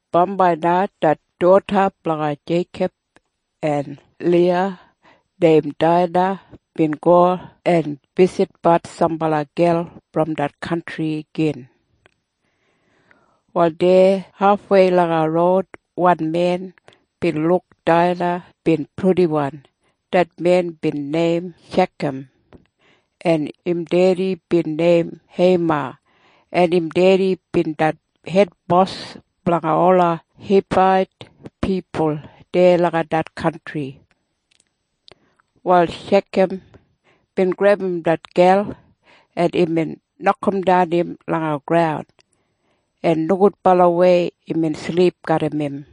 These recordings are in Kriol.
Bambai na det doda blanga Jeikob en Liya neim Daina bin go en bisitbat sambala gel brom det kantri gin. Wal deya hafwei langa roud wan men bin luk Daina bin purdiwan. Det men bin neim Shekam, en im dedi bin neim Heima, en im dedi bin det hedbos blanga ola Hibait pipul deya langa det kantri. Wal Shekam bin grebum det gel, en imbin nokamdan im langa roud, en nogudbalawei imbin silip garram im.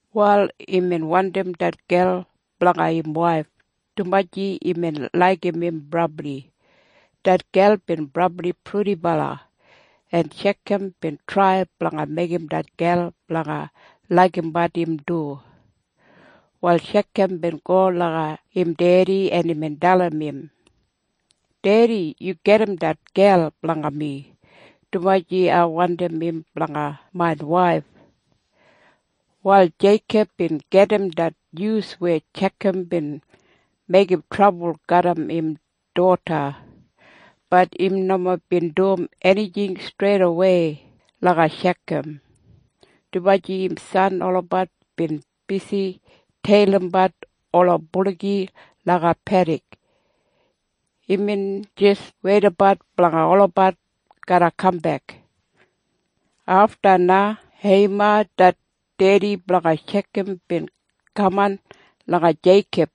Wal imbin wandim det gel blanga im waif, dumaji imbin laigim im brabli. Det gel bin brabli purdibala, en Shekam bin trai blanga meigim det gel blanga laigimbat im du. Wal Shekam bin go langa im dedi, en imbin dalim im, “Dedi, yu gedim det gel blanga mi, dumaji ai wandim im blanga main waif.” Wal Jeikob bin gedim det nyus weya Shekam bin meigim trabul garram im doda. Bat im nomo bin dum enijing streidawei langa Shekam, dumaji im san olabat bin bisi teilimbat ola buligi langa pedik. Imbin jis weidabat blanga olabat garra kambek. Afta na Heima det dedi blanga Shekam bin kaman langa Jeikob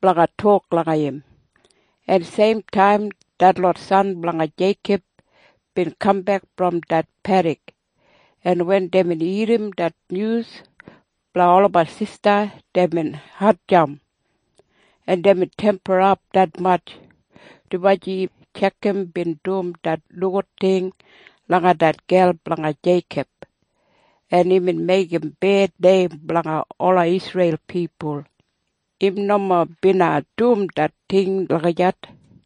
blanga tok langa im, en seim taim detlot san blanga Jeikob bin kambek brom det pedik. En wen deibin irrim det nyus blanga olabat sista, deibin hatjamp, en deibin temperap detmatj, dumaji Shekam bin dum det nogud ting langa det gel blanga Jeikob, en imbin meigim bed neim blanga ola Isreil pipul. Im nomo bina dum det ting lagijat.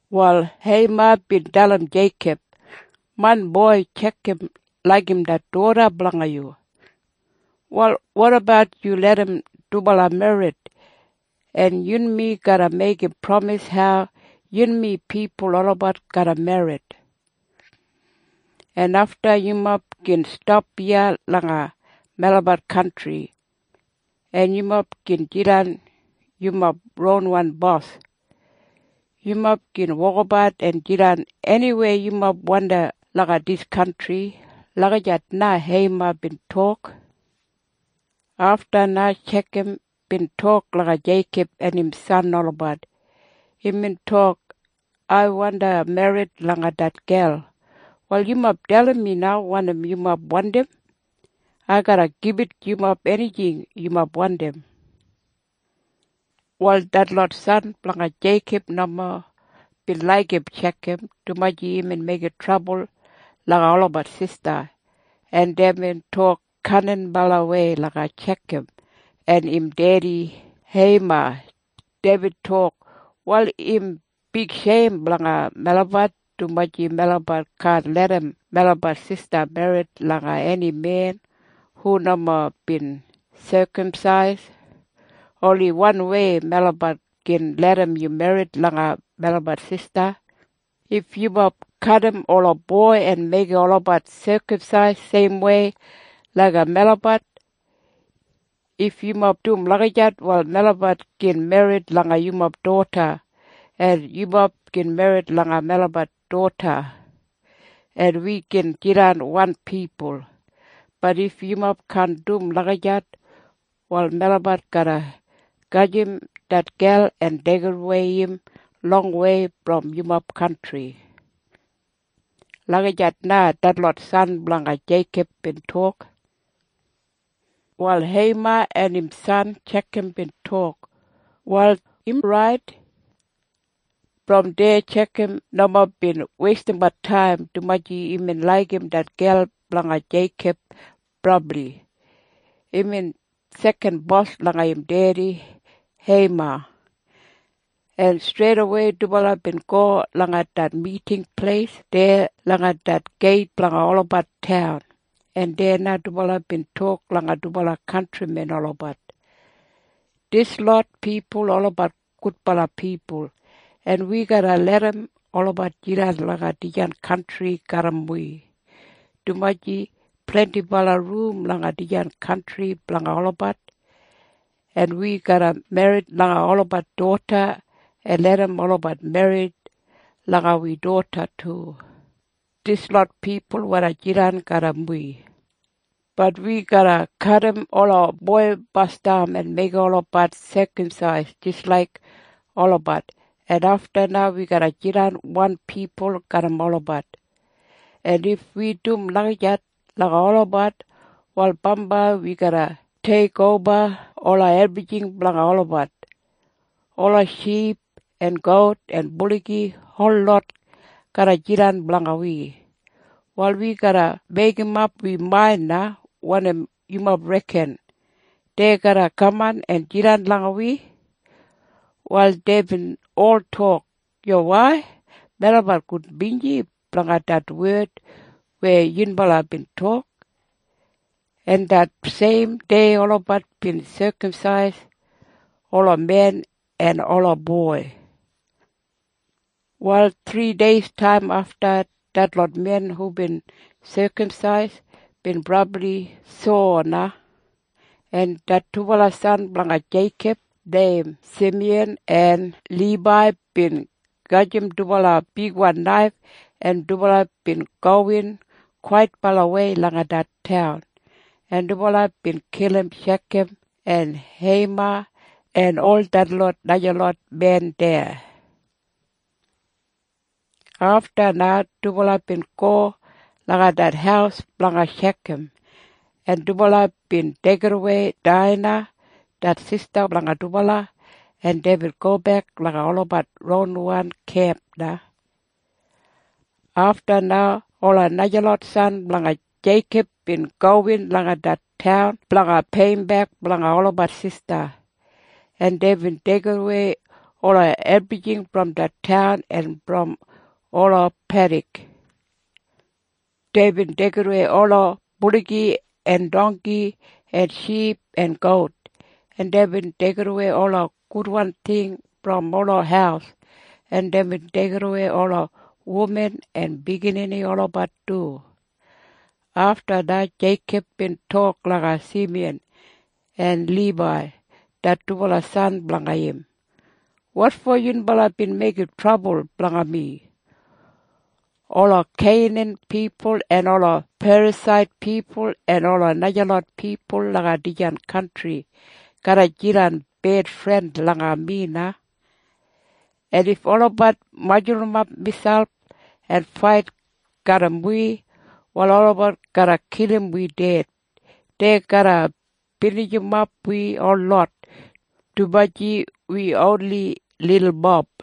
Wal Heima bin dalim Jeikob, “Main boi Shekam laigim det doda blanga yu. Wal wotabat yu larram dubala merrit. En yunmi garra meigim pramis hau yunmi pipul olabat garra merrit. En afta yumob gin stap iya langa melabat kantri, en yumob gin jidan yumob ronwan bos. Yumob gin wokabat en jidan eniweya yumob wandim langa dis kantri.” Lagijat na Heima bin tok. Afta na Shekam bin tok langa Jeikob en im san olabat. Imbin tok, “Ai wandi merrit langa det gel. Wal yumob dalim mi wanim yumob wandim. Ai garra gibit yumob enijing yumob wandim.” Wal detlot san blanga Jeikob nomo bin laigim Shekam, dumaji imbin meigim trabul langa olabat sista, en deibin tok kaninbalawei langa Shekam en im dedi Heima. Deibin tok, “Wal im bigsheim blanga melabat, dumaji melabat kaan larram melabat sista merrit langa eni men hu nomo bin sekamsais. Oni wanwei melabat gin larram yu merrit langa melabat sista. If yumob kadim ola boi en meigim olabat sekamsais seimwei laik melabat. If yumob dum lagijat, wal melabat gin merrit langa yumob doda, en yumob gin merrit langa melabat doda, en wi gin jidan wan pipul. Bat if yumob kaan dum lagijat, wal melabat garra gajim det gel en deigidawei im longwei brom yumob kantri.” Lagijat na detlot san blanga Jeikob bin tok. Wal Heima en im san Shekam bin tok, “Wal im rait.” Brom deya Shekam nomo bin weistimbat taim, dumaji imbin laigim det gel blanga Jeikob brabli. Imbin sekan bos langa im dedi Heima, en streidawei dubala bin go langa det miting pleis deya langa det geit blanga olabat taun, en deya na dubala bin tok langa dubala kantrimen olabat. “Dislot pipul olabat gudbala pipul, en wi garra larram olabat jidan langa dijan kantri garram wi, dumaji blendibala rum langa dijan kantri blanga olabat. En wi garra merrit langa olabat doda en larram olabat merrit langa wi doda du. Dislot pipul wandi jidan garram wi. Bat wi garra kadim ola boi basdam en meigim olabat sekamsais jis laik olabat. En afta na wi garra jidan wan pipul garram olabat. En if wi dum lagijat langa olabat, wal bambai wi garra deigimoba ola ebrijing blanga olabat. Ola ship en gout en buligi holot garra jidan blanga wi. Wal wi garra meigimap wi main na. Wanim yumob reken? Dei garra kaman en jidan langa wi?” Wal deibin ol tok, “Yuwai. Melabat gudbinji blanga det wed weya yunbala bin tok.” En det seim dei olabat bin sekamsais ola men en ola boi. Wal thrideistaim afta detlot men hubin sekamsais bin brabli sowa na, en det dubala san blanga Jeikob neim Simiyan en Libai bin gajim dubala bigwan naif, en dubala bin gowin kwaitbalawei langa det taun, en dubala bin kilim Shekam en Heima en ol detlot najalot men deya du. Afta na dubala bin go langa det haus blanga Shekam, en dubala bin deigidawei Daina det sista blanga dubala, en deibin gobek langa olabat ronwan kemp na. Afta na ola najalot san blanga Jeikob bin gowin langa det taun blanga peiyimbek blanga olabat sista, en deibin deigimwei ola ebrijing brom det taun en brom ola pedik. Deibin deigidawei ola buligi en dongki en ship en gout, en deibin deigidawei ola gudwan ting brom ola haus, en deibin deigidawei ola wuman en biginini olabat du. Afta na Jeikob bin tok langa Simiyan en Libai det dubala san blanga im, “Wotfo yunbala bin meigim trabul blanga mi? Ola Keinan pipul en ola Perasait pipul en ola najalot pipul langa dijan kantri garra jidan bedfren langa mi na. En if olabat majurrumap miselp en fait garram wi, wal olabat garra kilim wi ded. Dei garra binijimof wi holot, dumaji wi oni lilmob.”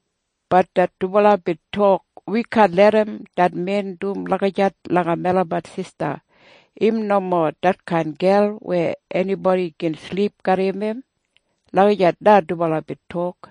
Bat det dubala bin tok, “Wi kaan larram det men dum lagijat langa melabat sista. Im nomo detkain gel weya enibodi gin silip garram im.” Lagijat na dubala bin tok.